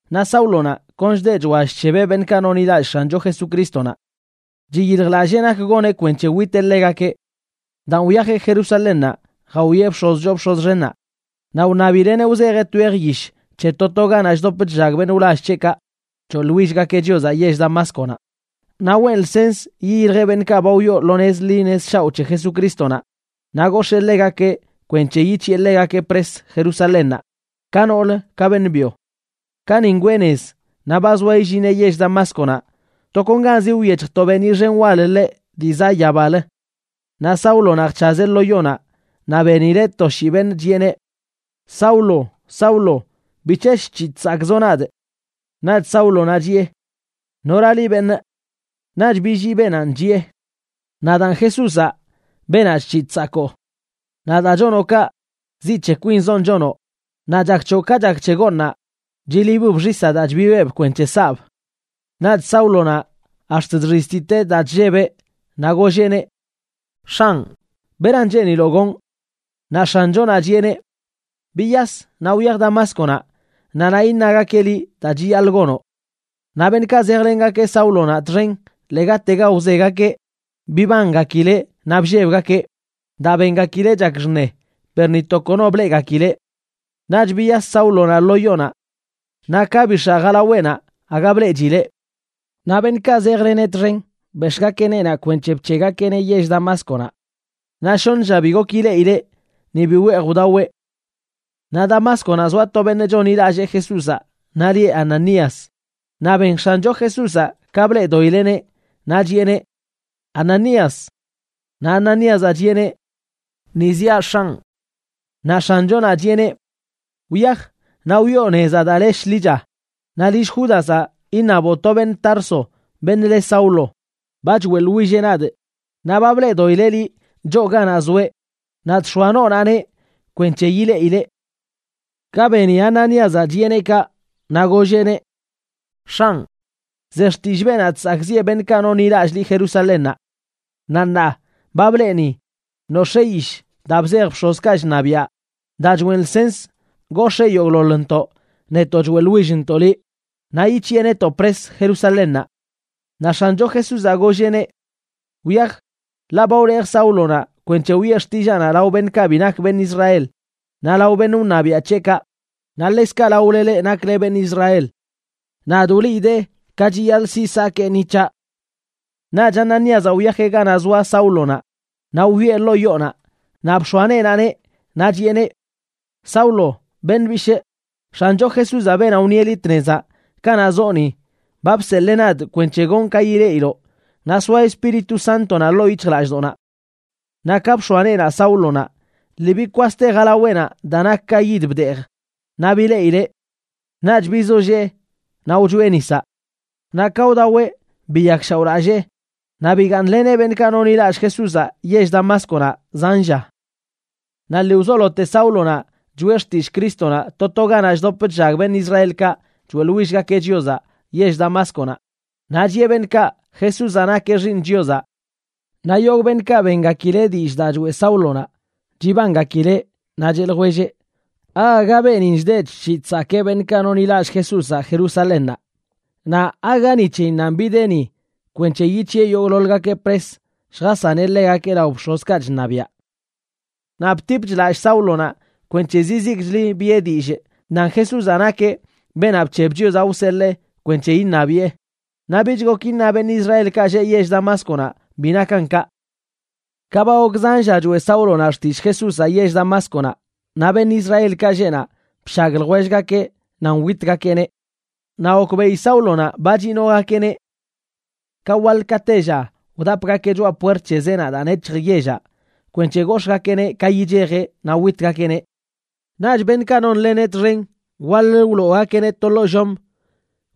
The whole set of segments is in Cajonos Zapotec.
Naꞌ Sáulonaꞌ kon chdeꞌ chwall chshebeꞌ beṉꞌkaꞌ nonḻilallꞌ X̱ancho Jesucrístonaꞌ. Chiyiljlallee nak goneꞌ kwenc̱he witeꞌ ḻegakeꞌ. Daan wyajeꞌ Jerusalénnaꞌ jawieꞌ bx̱oz choo bx̱oz xennaꞌ naꞌ wṉabileꞌneꞌ wzejeꞌ twej yish c̱he to to ganaꞌ chdop chllag beṉꞌ wlall c̱heꞌkaꞌ choeꞌḻwillgakeꞌ Chiozaꞌ yell Damásconaꞌ, naꞌ weꞌn lsens yiyiljeꞌ beṉꞌkaꞌ ba wyoo lo nez ḻi nez shaoꞌ c̱he Jesucrístonaꞌ naꞌ gox̱ee ḻegakeꞌ kwenc̱he yic̱hiꞌe ḻegakeꞌ pres Jerusalénnaꞌ, ka noolə ka beṉꞌ byo. Ka ni ngwee nez, naꞌ ba zoa illineꞌ yell Damásconaꞌ, tokonganzi wyec̱hj to beeniꞌ xen wal ḻeꞌ dii zaꞌ yabalə. Naꞌ Sáulonaꞌ jc̱hazeꞌ lo yonaꞌ naꞌ benileꞌ to shii beṉꞌ, chiꞌeneꞌ: ―Saulo, Saulo, ¿bic̱he chc̱hiꞌ chsakꞌzoꞌ nadꞌ? Naꞌch Sáulonaꞌ chiꞌe: ―¿Nora liꞌ, beṉꞌ? Naꞌch billii beenanꞌ, chiꞌe: ―Nadaan Jesúzaꞌ, beenaꞌ chc̱hiꞌ chsakoo. Naꞌ daa chonoꞌ kaꞌ, ziꞌ c̱he kwinzonꞌ chonoꞌ naꞌ chak c̱hoꞌ ka chak c̱he gooṉaꞌ chilibb xisaꞌ daa chbibeꞌb kwenc̱he saꞌb. Naꞌch Sáulonaꞌ ax̱t chxiztiteꞌ daa chllebeꞌ, naꞌ golleꞌneꞌ: ―X̱anꞌ, ¿beran cheeniloꞌ gonꞌ? Naꞌ X̱anchonaꞌ chiꞌeneꞌ: ―Biyas naꞌ wyaj Damásconaꞌ, naꞌ naꞌ iṉagakeꞌ liꞌ daa chiyaḻꞌ gonoꞌ. Naꞌ beṉꞌkaꞌ zejlengakeꞌ Sáulonaꞌ txen ḻegatega wzegakeꞌ bibangakileꞌ naꞌ bllebgakeꞌ, daa bengakileꞌ chak xṉe, per ni to kono bleꞌgakileꞌ. Naꞌch biyas Sáulonaꞌ lo yonaꞌ. Naꞌ ka bix̱aꞌ jalaweꞌnaꞌ aga bleꞌchileꞌ. Naꞌ beṉꞌkaꞌ zejleneꞌ txen bex̱ꞌgakeꞌ neenaꞌ kwenc̱he bc̱heꞌgakeꞌneꞌ yell Damásconaꞌ. Naꞌ shoṉ lla bi gok ileꞌileꞌ, ni bi weej wdaweꞌ. Naꞌ Damásconaꞌ zoa to beṉꞌ chonḻilallee Jesúzaꞌ naꞌ lieꞌ Ananías, naꞌ ben X̱ancho Jesúzaꞌ ka bleꞌdoꞌileꞌneꞌ, naꞌ chiꞌeneꞌ: ―Ananías. Naꞌ Ananíazaꞌ chiꞌeneꞌ: ―Ni ziaꞌ, X̱anꞌ. Naꞌ X̱anchonaꞌ chiꞌeneꞌ: ―Wyaj, naꞌ wyoo nezaꞌ daa le Shḻicha, naꞌ lill Júdazaꞌ iṉaboꞌ to beṉꞌ Tarso, beṉꞌ le Saulo. Ba choeꞌḻwilleꞌ nadꞌ, naꞌ ba bleꞌdoꞌileꞌ liꞌ choo ganaꞌ zoeꞌ naꞌ chx̱oa noonaꞌneꞌ kwenc̱he yileꞌileꞌ. Ka beni Ananíazaꞌ chiꞌeneꞌ kaꞌ, naꞌ golleꞌneꞌ: ―X̱anꞌ, ze xtillꞌ beenaꞌ chsakꞌziꞌe beṉꞌkaꞌ nonḻilallꞌ liꞌ Jerusalénnaꞌ. Naꞌ ṉaa ba blee ni nox̱ee yish daa bzej bx̱ozkaꞌ chṉabiaꞌ daa choꞌen lsens gox̱ee yogꞌḻoḻntoꞌ, netoꞌ choeꞌḻwillntoꞌ liꞌ, naꞌ yic̱hiꞌe netoꞌ pres Jerusalénnaꞌ. Naꞌ X̱ancho Jesúzaꞌ golleꞌneꞌ: ―Wyaj, ḻaꞌ ba wlejꞌ Sáulonaꞌ kwenc̱he wiꞌe xtillaanaꞌ lao beṉꞌkaꞌ bi nak beṉꞌ Israel, naꞌ lao beṉꞌ wṉabiaꞌ c̱heꞌkaꞌ, naꞌ ḻekzkaꞌ laole leꞌ nakle beṉꞌ Israel. Nadꞌ wliidee ka chiyaḻꞌ siꞌ sakee ni c̱haꞌ. Naꞌch Ananíazaꞌ wyajeꞌ ganaꞌ zoa Sáulonaꞌ naꞌ wyoꞌe ḻoo yoonaꞌ, naꞌ bx̱oa neenaꞌneꞌ. Naꞌ chiꞌeneꞌ: ―Saulo, beṉꞌ bishꞌ, X̱ancho Jesúzaꞌ, beenaꞌ wṉieꞌ liꞌ tnezaꞌ kanaꞌ zoꞌ ni, ba bseḻee nadꞌ kwenc̱he gonꞌ ka yileꞌiloꞌ naꞌ soa Espíritu Sántonaꞌ ḻoo yic̱hjlallꞌdoꞌnaꞌ. Naꞌ ka bx̱oa neenaꞌ Sáulonaꞌ, lii bikwaste jalaweꞌnaꞌ daa nak ka yid bdeej, naꞌ bileꞌileꞌ. Naꞌch bizollee naꞌ wchoeꞌ nisaꞌ. Naꞌ ka wdaweꞌ, biyakshaoꞌlallee, naꞌ bigaaṉleneꞌ beṉꞌkaꞌ nonḻilallꞌ Jesúzaꞌ yell Damásconaꞌ zan lla. Naꞌ lii wzolote Sáulonaꞌ choꞌe xtillꞌ Crístonaꞌ to to ganaꞌ chdop chllag beṉꞌ Israelkaꞌ choeꞌḻwillgakeꞌ Chiozaꞌ yell Damásconaꞌ, naꞌ chiꞌe beṉꞌkaꞌ Jesúzaꞌ nakeꞌ Xiiṉ Chiozaꞌ. Naꞌ yogꞌ beṉꞌkaꞌ bengakileꞌ dillꞌ daa choeꞌ Sáulonaꞌ chibangakileꞌ, naꞌ cheꞌ ljwelleꞌ: ―¿Aaga beenin chdeꞌ chc̱hiꞌ chsakee beṉꞌkaꞌ nonḻilallꞌ Jesúzaꞌ Jerusalénnaꞌ? Naꞌ ¿aaga ni c̱heyinnanꞌ bideꞌ ni kwenc̱he yic̱hiꞌe yogꞌḻoḻgakeꞌ pres lljasaneꞌ ḻegakeꞌ lao bx̱ozkaꞌ chṉabiaꞌ? Naꞌ btipch lallꞌ Sáulonaꞌ kwenc̱he zizikchli biꞌe dillꞌ nan Jesúzanꞌ nakeꞌ beenaꞌ bc̱heb Chiozaꞌ wseḻee kwenc̱he iṉabiꞌe, naꞌ bich gok iṉa beṉꞌ Israelkaꞌ lleꞌ yell Damásconaꞌ bi nakan kaꞌ. Ka ba gok zan lla choeꞌ Sáulonaꞌ xtillꞌ Jesúzaꞌ yell Damásconaꞌ, naꞌ beṉꞌ Israelkaꞌ lleꞌ naꞌ bshag ljwellgakeꞌ nan witgakeꞌneꞌ. Naꞌ gokbeꞌi Sáulonaꞌ ba chinogakeꞌneꞌ. Ka waḻ ka tella wdapgakeꞌ choꞌa puert c̱he zeenaꞌ daa nec̱hj yellaꞌ kwenc̱he gox̱ꞌgakeꞌneꞌ ka yichejeꞌ naꞌ witgakeꞌneꞌ. Naꞌch beṉꞌkaꞌ nonleneꞌ txen, waḻ-lə wloogakeꞌneꞌ to ḻoo llom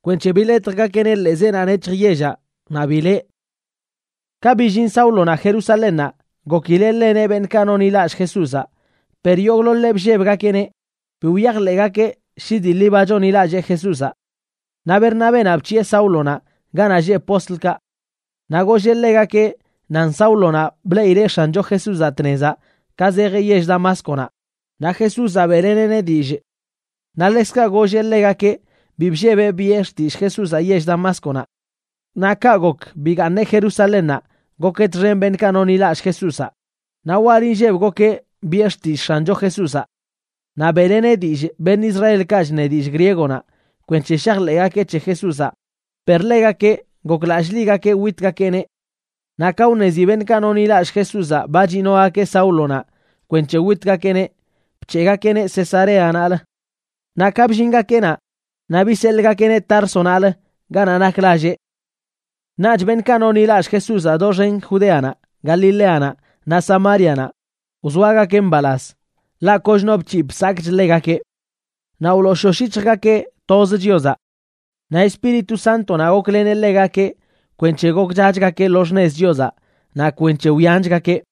naꞌ biḻetjgakeꞌneꞌ ḻee zeenaꞌ nec̱hj yellaꞌ kwenc̱he bileꞌ. Ka billin Sáulonaꞌ Jerusalénnaꞌ, gokileꞌ ḻeneꞌ beṉꞌkaꞌ nonḻilallꞌ Jesúzaꞌ, per yogꞌḻoḻeꞌ bllebgakeꞌneꞌ, bi wyajḻeꞌgakeꞌ shi dii ḻi ba chonḻilallee Jesúzaꞌ. Naꞌ Bernabénaꞌ bc̱hiꞌe Sáulonaꞌ ganaꞌ lleꞌ postlkaꞌ. Naꞌ golleꞌ ḻegakeꞌ nan Sáulonaꞌ bleꞌileꞌ X̱ancho Jesúzaꞌ tnezaꞌ ka zejeꞌ yell Damásconaꞌ, naꞌ Jesúzaꞌ beꞌleneꞌneꞌ dillꞌ. Naꞌ ḻekzkaꞌ golleꞌ ḻegakeꞌ bi bllebeꞌ biꞌe xtillꞌ Jesúzaꞌ yell Damásconaꞌ. Naꞌ kaꞌ gok bigaaṉeꞌ Jerusalénnaꞌ gokeꞌ txen beṉꞌkaꞌ nonḻilallꞌ Jesúzaꞌ, naꞌ wal inlleb gokeꞌ biꞌe xtillꞌ X̱ancho Jesúzaꞌ. Naꞌ beꞌleneꞌ dillꞌ beṉꞌ Israelkaꞌ chṉe dillꞌ griegonaꞌ kwenc̱he shajḻeꞌgakeꞌ c̱he Jesúzaꞌ, per ḻegakeꞌ goklallꞌligakeꞌ witgakeꞌneꞌ. Naꞌ ka wṉezi beṉꞌkaꞌ nonḻilallꞌ Jesúzaꞌ ba chinogakeꞌ Sáulonaꞌ kwenc̱he witgakeꞌneꞌ, bc̱heꞌgakeꞌneꞌ Cesareanaꞌlə. Naꞌ ka bllingakeꞌ naꞌ, naꞌ biseḻꞌgakeꞌneꞌ Társonaꞌlə ganaꞌ nak lalleꞌ. Naꞌch beṉꞌkaꞌ nonḻilallꞌ Jesúzaꞌ doxen Judeanaꞌ, Galileanaꞌ naꞌ Samárianaꞌ wzoagakeꞌ mbalaz, ḻaꞌ koch no bc̱hiꞌ bsakꞌch ḻegakeꞌ. Naꞌ wlooshosh yic̱hjgakeꞌ toz Chiozaꞌ. Naꞌ Espíritu Sántonaꞌ gokleneꞌ ḻegakeꞌ kwenc̱he gokchachgakeꞌ lo xṉez Chiozaꞌ naꞌ kwenc̱he wyanchgakeꞌ.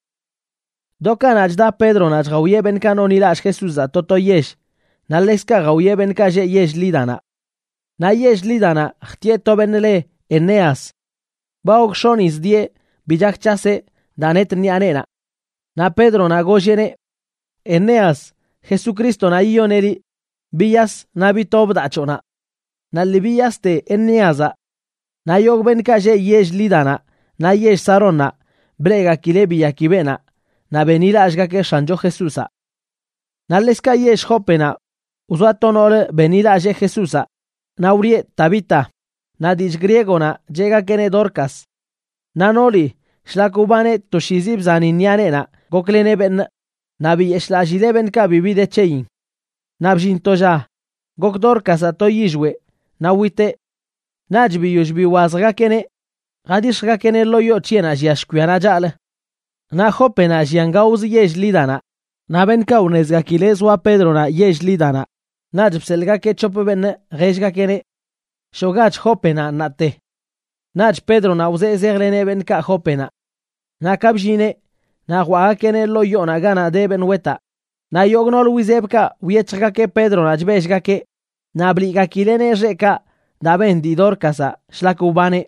Do kanaꞌ, chda Pédronaꞌ chjawieꞌ beṉꞌkaꞌ nonḻilallꞌ Jesúzaꞌ to to yell, naꞌ ḻekzkaꞌ jawieꞌ beṉꞌkaꞌ lleꞌ yell Lídanaꞌ. Naꞌ yell Lídanaꞌ jtiꞌe to beṉꞌ leꞌ Eneas. Ba gok x̱onꞌ yiz dieꞌ bi chak c̱haseꞌ daa net ṉiꞌa neenaꞌ. Naꞌ Pédronaꞌ golleꞌneꞌ: ―Eneas, Jesucrístonaꞌ yiyoneꞌ liꞌ. Biyas naꞌ bitob daa c̱hoꞌnaꞌ. Naꞌ lii biyaste Enéazaꞌ. Naꞌ yogꞌ beṉꞌkaꞌ lleꞌ yell Lídanaꞌ naꞌ yell Sarónnaꞌ, bleꞌgakileꞌ biyaki beenaꞌ naꞌ benḻilallꞌgakeꞌ X̱ancho Jesúzaꞌ. Naꞌ ḻekzkaꞌ yell Jópenaꞌ wzoa to noolə benḻilallee Jesúzaꞌ, naꞌ wlieꞌ Tabita,a naꞌ dillꞌ griegonaꞌ cheꞌgakeꞌneꞌ Dorcas. Naꞌ nooli, shlak wbaneꞌ toshiizi bzani ṉiꞌa neenaꞌ gokleneꞌ beṉꞌ, naꞌ biyeshꞌlallileꞌ beṉꞌkaꞌ bibi de c̱heyin. Naꞌ bllin to lla gok Dorcazaꞌ to yillweꞌ naꞌ witeꞌ. Naꞌch biyoll biwazjgakeꞌneꞌ, jadix̱jgakeꞌneꞌ ḻoo yoo c̱heꞌnaꞌ llia shkwianaꞌ chaꞌlə. Naꞌ Jópenaꞌ llian gaozə yell Lídanaꞌ, naꞌ beṉꞌkaꞌ wṉezgakileꞌ zoa Pédronaꞌ yell Lídanaꞌ, naꞌch bseḻꞌgakeꞌ c̱hop beṉꞌ jellgakeꞌneꞌ: ―Shoꞌgach Jópenaꞌ ṉaate. Naꞌch Pédronaꞌ wzee zejleneꞌ beṉꞌkaꞌ Jópenaꞌ. Naꞌ ka bllineꞌ, naꞌ jwaꞌgakeꞌneꞌ ḻoo yoonaꞌ ganaꞌ de beṉꞌ wetaꞌ, naꞌ yogꞌ nool wizebkaꞌ wyec̱hjgakeꞌ Pédronaꞌ chbellgakeꞌ, naꞌ bliꞌgakileꞌneꞌ xeꞌkaꞌ daa ben dii Dorcazaꞌ shlak wbaneꞌ.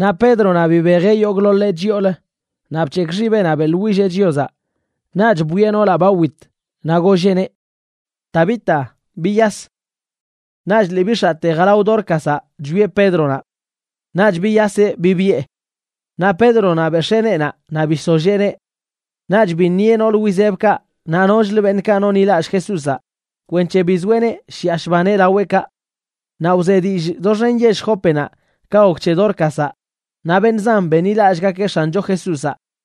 Naꞌ Pédronaꞌ bibejeꞌ yogꞌḻoḻeꞌ chyoolə, naꞌ bc̱hekꞌ xibeꞌnaꞌ beꞌḻwilleꞌ Chiozaꞌ. Naꞌch bwieꞌ noolaꞌ ba wit naꞌ golleꞌneꞌ: ―Tabita, biyas. Naꞌch lii bix̱aꞌte jalao Dorcazaꞌ chwieꞌ Pédronaꞌ. Naꞌch biyaseꞌ bibiꞌe. Naꞌ Pédronaꞌ bex̱ee neenaꞌ naꞌ bisolléeneꞌ. Naꞌch biṉieꞌ nool wizebkaꞌ naꞌ nochlə beṉꞌkaꞌ nonḻilallꞌ Jesúzaꞌ kwenc̱he bizoeꞌneꞌ shiꞌa shbaneꞌ laweꞌkaꞌ. Naꞌ wze dillꞌ doxen yell Jópenaꞌ ka gok c̱he Dorcazaꞌ, naꞌ beṉꞌ zan benḻilallꞌgakeꞌ X̱ancho Jesúzaꞌ.